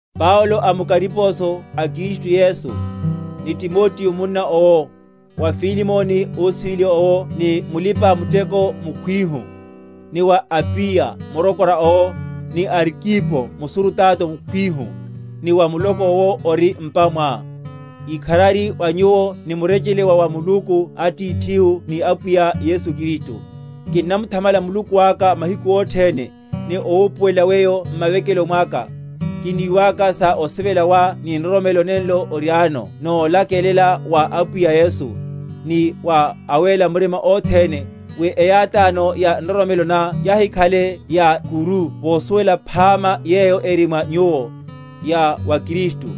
Paulo amukariposo a Kristu Yesu, ni Timoteo munna owo, wa Filemoni ósiveliwa owo ni mulípa‐muteko mukhwihu, ni wa Apiya murokora owo, ni Arkipo musurutato mukhwihu, ni wa muloko yowo ori m’pa mwá: Ikharari wa nyuwo ni murechele wa wa Muluku Atithihu ni Apwiya Yesu Kristu. Kinnamuthamala Muluku aka mahiku othene, ni owupuwela weyo m’mavekeloni mwaka, kiniwaka sa osivela wá ni nroromelo nenlo oriáno nolakelela wa Apwiya Yesu, ni wa awéla murima othene; wi eyátáno ya nroromelo ná yahikhale ya ’kuru vosuwela yaphama yeyo eri mwa nyuwo, ya wa Kristu.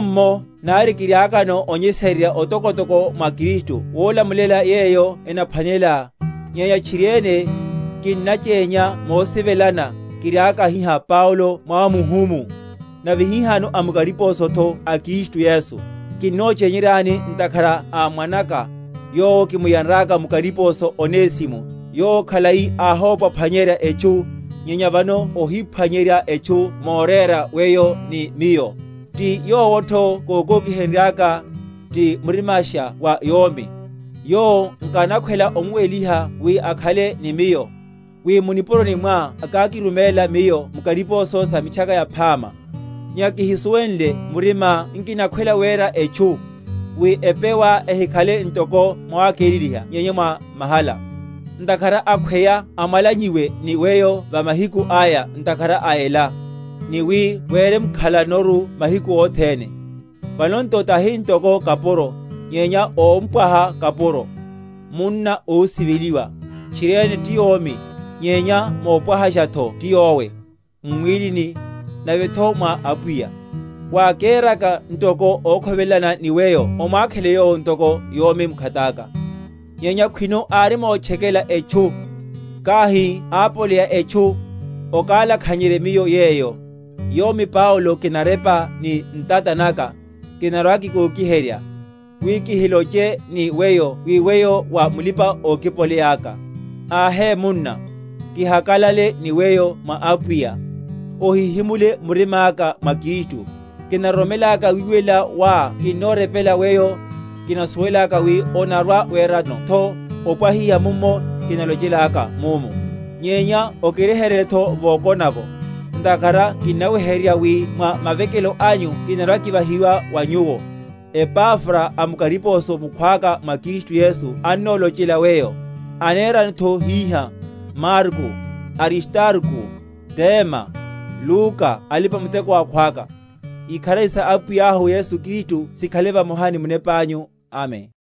Mummo, nari kiriakano onyesererya otokotoko mwa Kristu wolamulela yeyo enaphwanelela, nyenya tchiriene, kinnachenya mosivela, kiriaka hiha Paulo mwamuhumu, nave hihano amukariposotho a Kristu Yesu; kinnochenyerya ntakhara a mwanaka, yowo kimuyanraka mukariposo, Onesimo, yowo khalai ahóphwa‐phwanyenrye etchu, nyenya vano óniphwanyerya etchu morera weyo ni miyo; ti yowotho kókokihenryaka, ti murimasha wa yomi. Yowo nkanakhwela omuwehiha wi akhale ni miyo, wi mu nipuroni mwá akákiruméla miyo m’kariposo sa Mitchaka Yaphama: nyenya kihisuwenle murimá nkinakhwela wera etchu; wi epewá ehikhale ntoko mwawakeleliha nyenya mwa mahala. Ntakhara akhweya amwalanyiwe ni weyo va mahiku aya ntakhara a ela, ni wi werekemkhalanoru mahiku othene; vanotho tahi ntoko kapuro, nyenya ómpwaha kapuro, munna ósiveliwa, tchiriene ti yomi, nyenya mopwahashatho ti yowe, m’mwílini, navetho mwa Apwiya. Wákéraka nto okhovelelana ni weyo omwakhele yowo ntoko yomi mkhataka. Nyenya khwino árimotchekela etchu, kahi ápoleya etchu, okalakhanyerye miyo yeyo; yomi Paulo kinarepa ni ntata naka, kinarwa‐kikokiherya; wi kihiloche ni weyo wi weyo wa mulipa‐okipoleya aka. Ahe, munna, kihakalale ni weyo mwa Apwiya: ohihimule murimáka mwa Kristu. Kinaroromelaka wiwelela wá kinnorepela weyo, kinasuwelaka wi onarwa‐weranotho opwahiha momu kinalochelaka ’mu. Nyenya okiryeheryeletho vokona’vo; ntakhara kinnaweheryerya wi mwa mavekelo anyu kinarwa‐kivahiwa wa nyuwo. Epafra amukariposo mukhwaka mwa Kristu Yesu annolochela weyo; aneranotho hiha, Marko, Aristarko, Dema, Luka alipa‐muteko akhwaka. Ikharari sa Apwiyahu Yesu Kristu sikhale vamoha ni munepanyu. Amen.